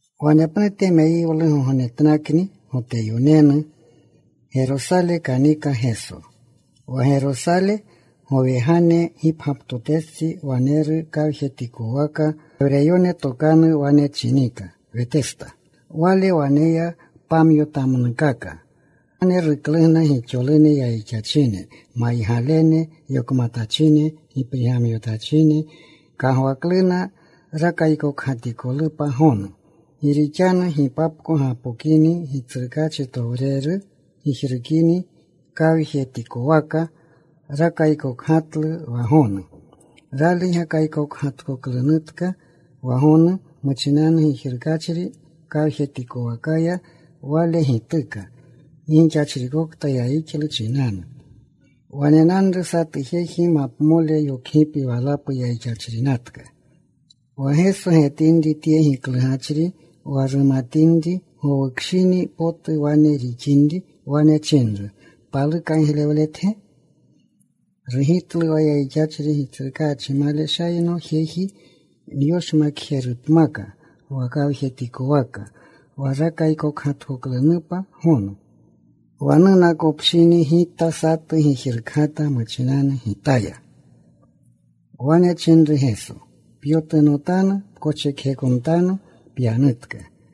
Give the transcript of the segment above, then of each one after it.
Wanepnute meyiwlugognetnakni Goteyonenu. Gerosale kanika Geso. Wa Gerosale, gowegane gipgyaptotestsi, waneru kawjetikwaka. Gewreyone tokanu wane chinika Wetesta. Wale waneya pamyotamnukaka. Wane ruklugna gixolune yayixachine, maygalene, yokmatachine, giprigmanetachine. Kagwakluna rakaykokgatikolupa gonu. Gi rixanu gipapko gapokini Gitsrukaachitowreru gijrukini kawjetikwaka. Rakaykokgatlu wa gonu. Rali gakaykokgatkoklunutka wa gonu, muchinanu gijrukgatachri kawjetikowakaya, wale gituka gi gixachrikokta yayixlu chinanu. Wanenanru satu jeji mapamole yokgipi walapu yayixachrinatka. Wa Geso getinri tye giklugachri, wa rumatinri gowukshini potu wane rawinri, wane chinru, “¿Paluka giglewletge?” Rugitlu wa yayixachri, “Gitsrukaachi, maleshayanno jeji nyoshmakjerupmaka wa kawjetikowaka wa rakaykokgatkoklunupa gonu. Wa nunakopshini gita satu gijrukgata muchinanu gitaya.” Wane chinru Geso, “Pyotunotanu. Pkoschekjekotanu. Pyanutka.”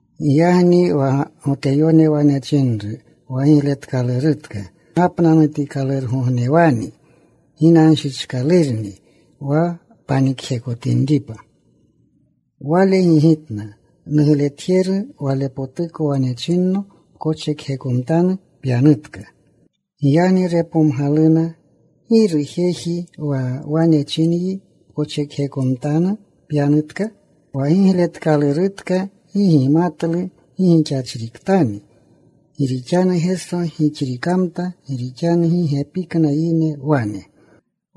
Giyagni wa Goteyone wane chinru wa gigletkalurutka, “Gapnanutikalurugognewani. Ginanshichkalurni wa panikjekotinripa.” Wale gigitna, “Nugletjeru Walepotuko wane chinno, ‘Pkoschekjekotanu. Pyanutka.’” Giyagni repomgaluna, “¿Giru jejni wa wane chinyi, ‘Pkoschekjekotanu. Pyanutka?’” Wa gigletkalurutka gi gimatlu gi gixachritkani. Gi rixanu Geso gixrikamta, gi rixanu gi gepikna yine wane.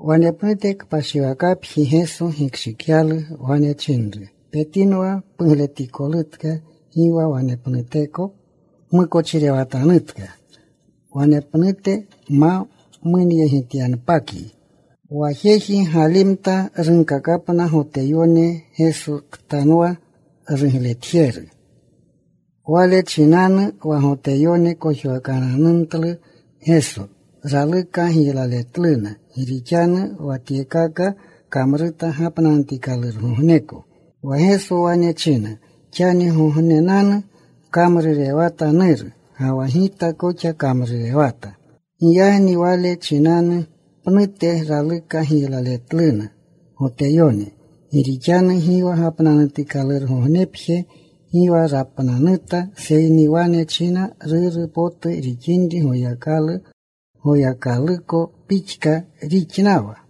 Wanepnute kpashiwakapji Geso gikshikyalu. Wane chinru, “Petinwa. Pugletikolutka. Gi wa wanepnuteko pmukochirewatanutka, wane pnuterutu ma munyegityanpatkayi.” Wa jeji galimta. Runkakapna Goteyone, Gesoktanwa rugletjeru. Wale chinanu wa Goteyone kojwakananumtlu Geso. Raluka giylaletluna, gi rixanu wa tyekaka kamruta gapnanutikalurgogneko. Wa Geso wane chinna, “Xangognenanu kamrurewata Nuru, ga wa Gita koxa kamrurewata.” Giyagni wale chinanu pnute raluka giylaletluna Goteyone, gi rixanu gi wa gapnanutikalurgognepje gi rapnanuta, seyni wane china Ruru potu rixinri Goyakalu. Goyakaluko pixka rixnawa.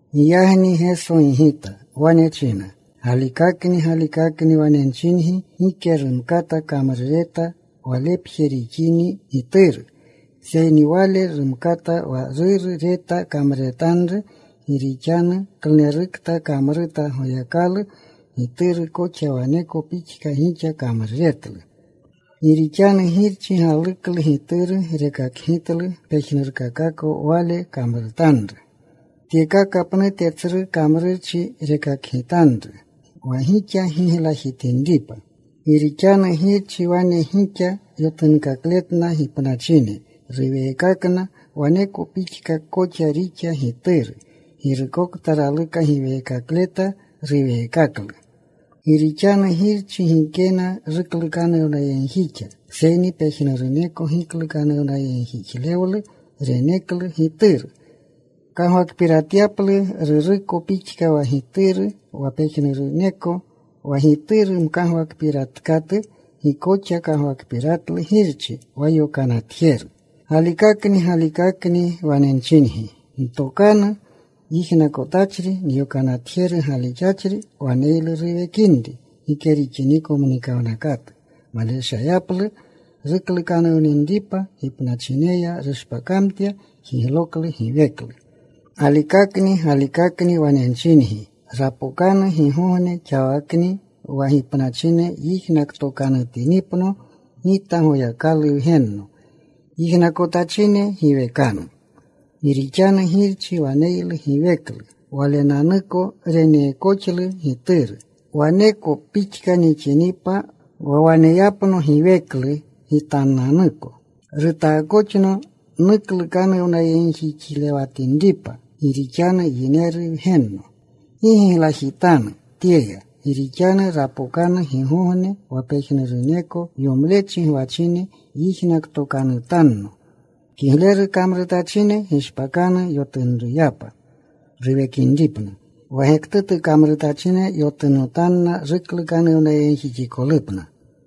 Giyagni Geso gigita. Wane chinna, “Galikakni, galikakni, wane nchingi, gike rumkata kamrureta Walepje rixini Gituru, seyni wale rumkata wa Ruru reta kamruretanru, gi rixanu klunerukta kamruta Goyakalu, Gituru koxa waneko pixka gixa kamruretlu. Gi rixanu Girchi galuklu Gituru. Rekakgitlu pejnurkakako Wale kamrutanru. Tyekaka pnute tsru kamrurchi rekakgitanru wa gixa giglajitinripa. Gi rixanu Girchi wane gixa yotunkakletna gipnachine. Ruweekakna. Waneko pixka koxa rixa Gituru. Girukokta raluka giweekakleta, ruweekaklu. Gi rixanu Girchi gikena ruklukanuwnayegjixa. Seyni pejnuruko giklukanuwnayegjixlewlu reneklu Gituru. Kagwakpiratyapluna Ruruko pixka wa Gituru wa pejnuruneko. Wa Gituru mkagwakpiratkatu, gi koxa kagwakpiratlu Girchi wa yokanatjeru. “Galikakni, galikakni wane nchingi, ntokanu yijnakotachri, nyokanatjeru galixachri waneylu ruwekinri gike rixiniko mnikawnakatu. Maleshayaplu ruklukanuwninripa. Gipnaluya rushpakamtya. Jigloklu giweklu. Galikakni, galikakni wane nchingi, rapokanu gigogne, xawaknini wa gipnachine yijnaktokanutinipno Gita Goyakalu Wgenno. Yijnakotachine giwekanu. Gi rixanu Girchi waneylu giweklu Walenanuko. Reneekoxlu Gituru waneko pixka nixinripa wa waneyapno giweklu Gitananuko. Rutaakoxno nuklukanuwnayegjixlewatinripa gi rixanu Yineru Wgenno. “Gi giglajitanu tyeya, gi rixanu rapokanu gigogne wa pejnuruneko yomlechi gwachine yijnaktokanutanno. Kigleru kamrutachine gishpakanu yotunruyapa ruwekinripna. Wa gektutu kamrutachine yotunotanna ruklukanuwnayegjixikolupna.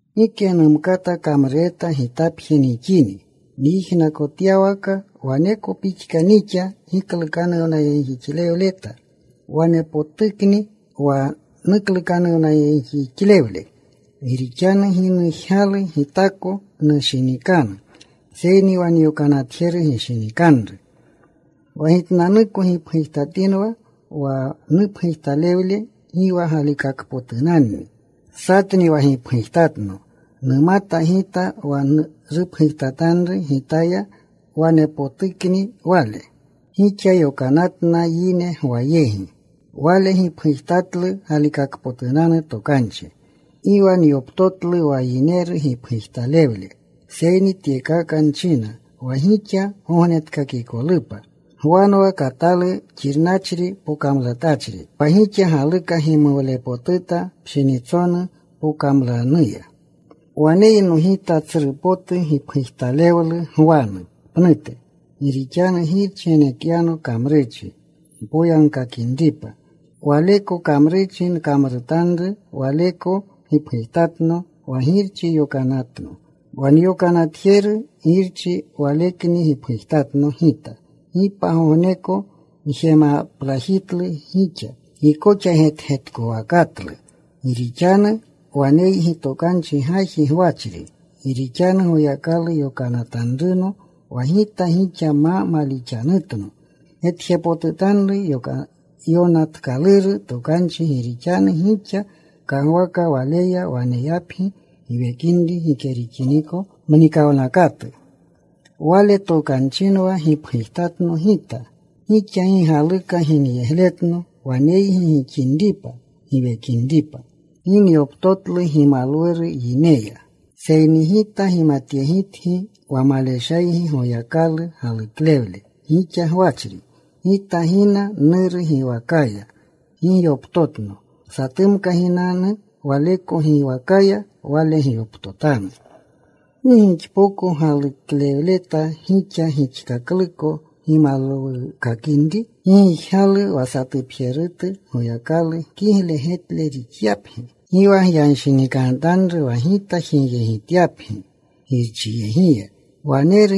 “Gike numkata kamrureta Gitapje nixini. Nyijnakotyawaka waneko pixka nixa giklukanuwnayegjixlewleta. Wanepotukni wa nuklukanuwnayegjixlewle. Gi rixanu gi nujgalu Gitako nushinikanru, seyni wa nyokanatjeru gishinikanru. Wa Gitnanuko gipgujtatinwa, wa nupgujtalewle gi wa galikakpotunanni. Satni wa gipgujtatno. Numata Gita wa rupgujtatanru Gitaya wanepotukni wale. “Gixa yokanatna yine Gwa yegi. Wale gipgujtatlu galikakpotunanu tokanchi. Gi wa nyoptotlu wa yineru gipgujtalewle. Seyni tyekaka nchina wa gixa gognetkakikolupa. Gwanwa katalu xirnachri, pokamlatachri. Wa gixa galuka gimuwlepotuta pshinitsonu pokamlanuya. “Waneyno Gita tsru potu gipgujtalewlu Gwanu pnute. Gi rixanu Girchi genekyano kamrurchi npoyagkakinripa. Waleko kamrurchi nkamrutanru, waleko gipgujtatno wa Girchi yokanatno. Wa nyokanatjeru Girchi Walekni gipgujtatno Gita. Gi pagogneko gjemaplajitlu gixa. Gi koxa getgetkowakatlu. Gi koxa waneygi tokanu gaji gwachri. Gi rixanu Goyakalu yokanatanruno, wa Gita gixa ma malixanutno. Getjepotutanru yonatkaluru tokanchi, gi rixanu gixa kagwaka waleya waneyapgi giwekinri gike rixiniko mnikawnakatu. Wale tokanchinwa gipgujtatno Gita. Gixa gi galuka ginyegletno waneygi gixinripa giwekinripa. “Gi nyoptotlu gimalwuru yineya. “Seyni Gita gimatyegitgi wa maleshaygi Goyakalu galuklewle gixa gwachri. Gita gina Nuru giwakaya. Gi gyoptotno. Satumka ginanu waleko giwakaya, wale gyoptotanu. ¿Gi gixpoko galixleta gixa, gixkakluko gimalwukakinri? Gi gijgalu wa satupjerutu Goyakalu kigle getle rixyapgi. “Gi wa gyanshinikanutanru wa Gita jigyegitangi Girchiyegiya. Waneru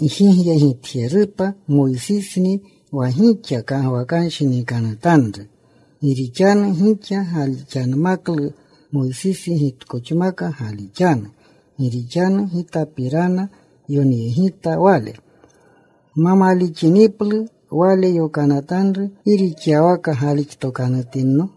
gjigyegitjerupa. Moysisni wa gixa kagwakanshinikanutanru. Gi rixanu gixa galixanmaklu Moysisi, gitkoxmaka galixanu. Gi rixanu Gitapirana yonyegita wale. Gma malixiniplu wale yonatanru ¿gi rixyawaka galixtokanutinno?”